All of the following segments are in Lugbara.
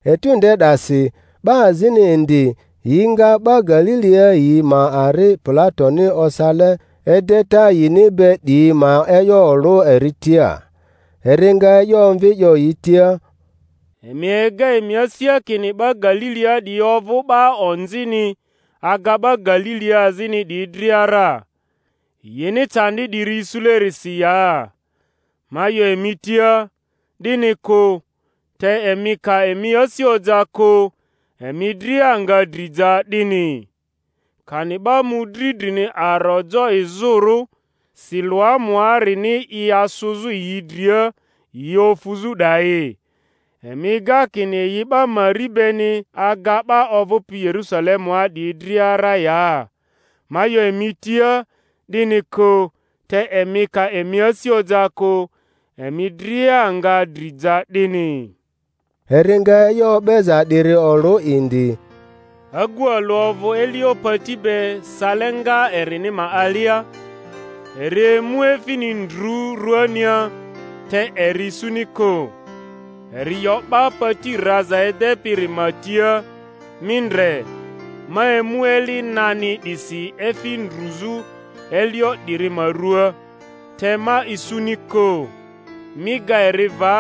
Etu nde 'dasi 'ba azini indi yi nga 'ba Galilia yi ma ari Pilatoni osale edeta yini be 'diyi ma e'yo olᴜ eri tia. Eri nga e'yo omvi 'yo yi tia, Emi ega emi asia kini 'ba Galilia 'diyi ovᴜ 'ba onzini aga 'ba Galilia azini 'diyi dria ra, yini candi 'diri isulerisi ya? Ma 'yo emi tia, 'Dini kᴜ; te emi ka emi asi oja kᴜ, emi dria nga dri ja 'dini. Kani 'ba mᴜdri drini aro jo izᴜrᴜ Siloamuarini i asᴜzᴜ yi dria yi ofᴜzᴜ 'dayi, emi ega kini yi 'ba mari beni aga 'ba ovᴜpi Yerusalemua 'diyi dria ra ya? Ma 'yo emi tia, 'Dini kᴜ; te emi ka emi asi oja kᴜ, emi dria nga dri ja 'dini. Eri nga e'yo o'beza 'diri olᴜ indi: Agu alᴜ ovᴜ elio pati be sale nga erini ma alia; eri emu efini ndru ruania, te eri isuni kᴜ. Eri 'yo 'ba pati raza edepiri ma tia, Mi ndre, ma emu eli nani 'disi efi ndruzᴜ elio 'diri ma ruaa, te ma isuni kᴜ. Mi ga eri va;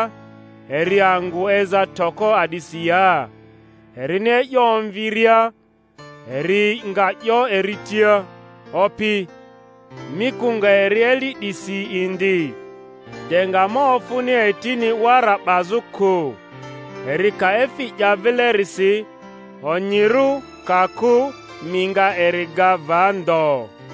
eri angᴜ eza toko a'disi ya? Erini e'yo omvi-ria eri nga 'yo eri tia, Opi, mi kᴜ nga eri eli 'disi indi, de nga ma ofᴜni etini wara 'bazᴜ kᴜ. Eri ka efi 'ya vilerisi, onyirᴜ; ka kᴜ, mi nga eri ga va ndo.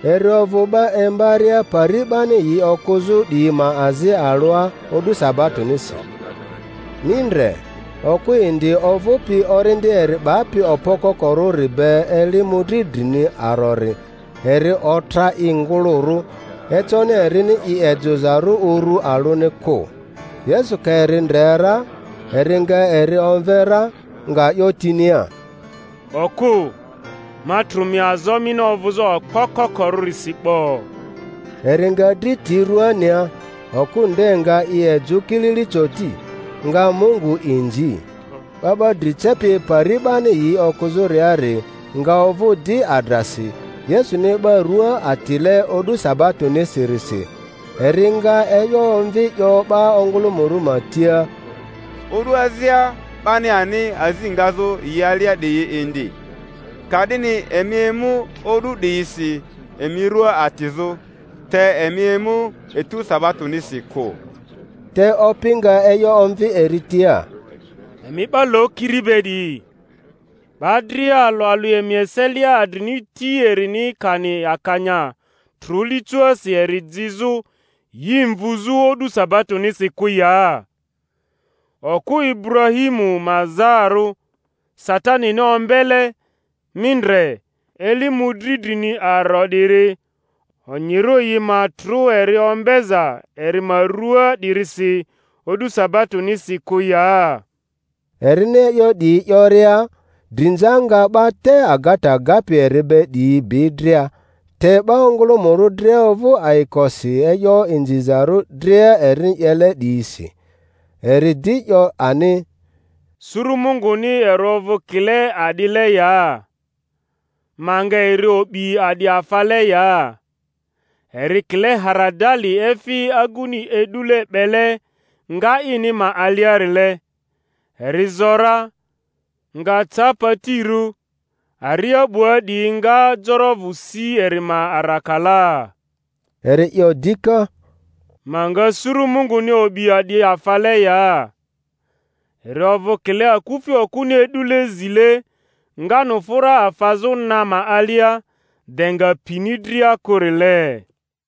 Eri ovᴜ 'ba imbaria pari 'bani yi okᴜzᴜ 'diyi ma azi alᴜa o'du sabatonisi. Mi ndre, okᴜ indi ovᴜpi orindi eri 'bapi okpo kokorᴜri be eli mᴜdri drini arori; eri otra i ngᴜlᴜrᴜ, econi erini i ejᴜzarᴜ uru alᴜni kᴜ. Yesu ka eri ndre ra, eri nga eri omve ra, nga 'yo tinia, Okᴜ, ma trᴜ mi azo mini ovᴜzᴜ okpo kokorᴜrisi 'bo. Eri nga dri ti rᴜania; okᴜ nde nga i ejᴜ kilili coti, nga Mungu inzi. 'Ba 'ba dri cepi pari 'bani yi okᴜzᴜriari nga ovᴜ di adrasi Yesuni 'ba rᴜa atile o'du sabatonisirisi, eri nga e'yo omvi 'yo 'ba ongᴜlᴜmᴜrᴜ ma tia, O'du azia 'bani ani azi ngazᴜ yi alia 'diyi indi; ka'dini emi emu o'du 'diyisi emi rua atizᴜ, te emi emu etu sabatonisi kᴜ. Te Opi nga e'yo omvi eri tia, Emi 'ba lokiri be 'diyi! 'Ba dria alᴜ alᴜ emi eselia adrini ti erini kani akanya trᴜ licoasi eri jizᴜ yi mvuzᴜ o'du sabatonisi kᴜ ya? Okᴜ Iburahimu ma zaarᴜ, Sa-tanini ombele, mi ndre, eli mᴜdri drini aro 'diri, onyirᴜ yi ma trᴜ eri ombeza eri ma ruaa 'dirisi o'du sabatonisi kᴜ ya? Erini e'yo 'diyi 'yoria, drinza nga 'ba te agata gapi eri be 'diyi bi dria; te 'ba ongᴜlᴜmᴜrᴜ dria ovᴜ ayikosi e'yo inzizarᴜ dria erini 'yele 'diyisi. Eri di 'yo ani, Suru Munguni eri ovᴜ kile a'dile ya? Ma nga eri o'bi a'di afale ya? Eri kile haradali efi aguni e'dule 'bele nga ini ma aliarile; eri zo ra, nga ca patirᴜ, aria 'bua 'diyi nga jorovᴜ si eri ma arakalaa. Eri 'yo dika, Ma nga suru Munguni o'bi a'di afale ya? Eri ovᴜ kile akufi okᴜni e'dule zile nganufᴜra afazᴜ na ma alia, de nga pini dria kᴜrile.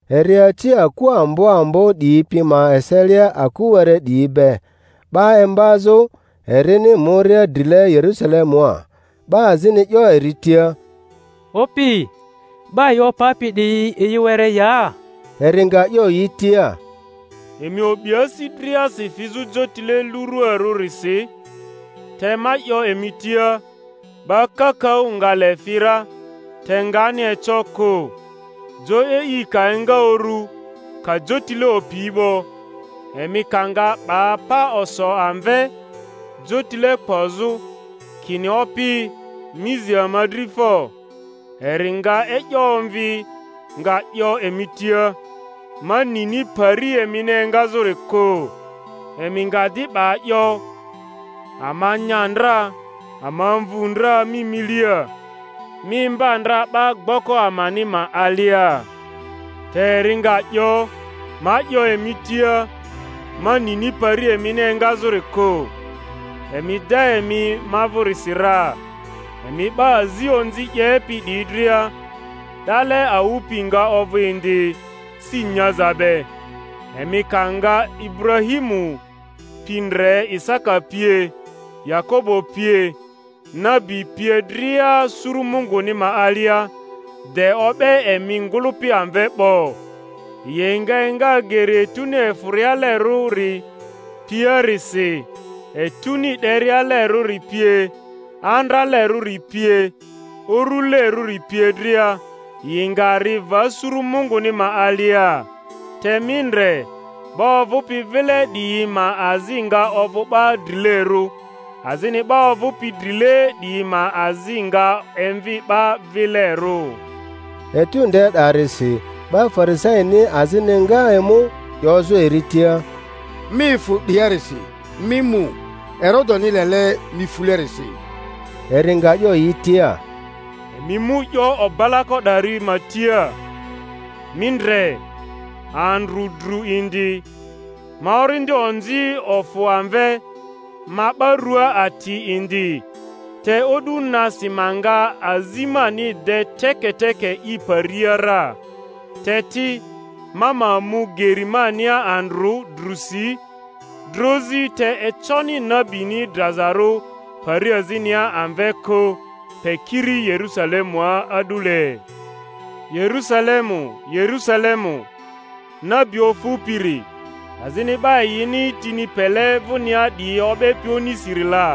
Eri aci aku ambo ambo 'diyi pi ma eselia aku were 'diyi be, 'ba imbazᴜ, erini muria drile Yerusalemua. 'Ba azini 'yo eri tia, Opi, 'ba yi opapi 'diyi yi were ya? Eri nga 'yo yi tia, Emi o'bi asi driasi fizᴜ jotile luruarᴜrisi; te ma 'yo emi tia, 'ba kakaᴜ nga le fi ra, te ngani eco kᴜ. Jo e'i ka enga uru, ka jotile opi 'bo, emi ka nga 'ba pa oso amve, jotile kpozᴜ, kini, Opi, mi zi ama dri fo; eri nga e'yo omvi, nga 'yo emi tia, Ma nini pari emini engazᴜri kᴜ. Emi nga di 'ba 'yo, Ama nya ndra, ama mvu ndra mi milia, mi imba ndra 'ba gboko amani ma alia. Te eri nga 'yo, Ma 'yo emi tia, ma nini pari emini engazᴜri kᴜ; emi da emi ma vᴜrisi ra, emi 'ba azi onzi 'yepi 'diyi dria! 'Dale awᴜ pi nga ovᴜ indi, si nyaza be, emi ka nga Iburahmiu pi ndre, Isaka pie, Yakobo pie, nabi pie dria suru Munguni ma alia, de o'be emi ngᴜlᴜpi amve 'bo. Yi nga enga geri etuni efᴜrialerᴜri piarisi, etuni 'derialerᴜri pie, andralerᴜri pie, urulerᴜri pie dria, yi nga ri va suru Munguni ma alia. Te mi ndre, 'ba ovᴜpi vile 'diyi ma azi nga ovᴜ 'ba drilerᴜ, azini 'ba ovᴜpi drile 'diyi ma azi nga emvi 'ba vilerᴜ. Etu nde 'darisi 'ba Farisaini azini nga emu, 'yozᴜ eri tia, Mi efᴜ 'diarisi, mi mu, Herodeni lele mi fulerisi. Eri nga 'yo yi tia, Emi mu 'yo obalako 'dari ma tia, Mi ndre, andrᴜ dru indi, ma orindi onzi ofᴜ amve, ma 'ba rua ati indi, te o'du nasi ma nga azi mani de teke-teke i paria ra. Te ti, ma ma mu geri mania andrᴜ, drusi, drozi; te econi nabini drazarᴜ pari azinia amve kᴜ, pe kiri Yerusalemua a'dule. Yerusalemu, Yerusalemu, nabi ofupiri, azini 'ba yini tini pele vᴜnia 'diyi o'bepi onisiri la!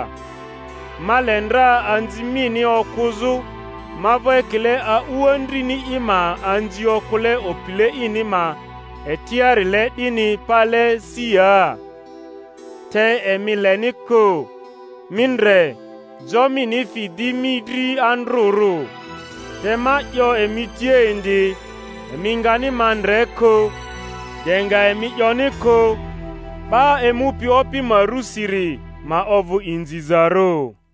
Ma le ndra anzi mini okᴜzᴜ ma vᴜ ekile a'u andrini i ma anzi okᴜle opile ini ma etiarile 'dini pale si ya, te emi leni kᴜ! Mi ndre, jo mini fi di mi dri andrᴜrᴜ. Te ma 'yo emi tia indi, Emi ngani ma ndre kᴜ, de nga emi 'yoni kᴜ, 'Ba emupi Opi ma rusiri ma ovᴜ inzizarᴜ!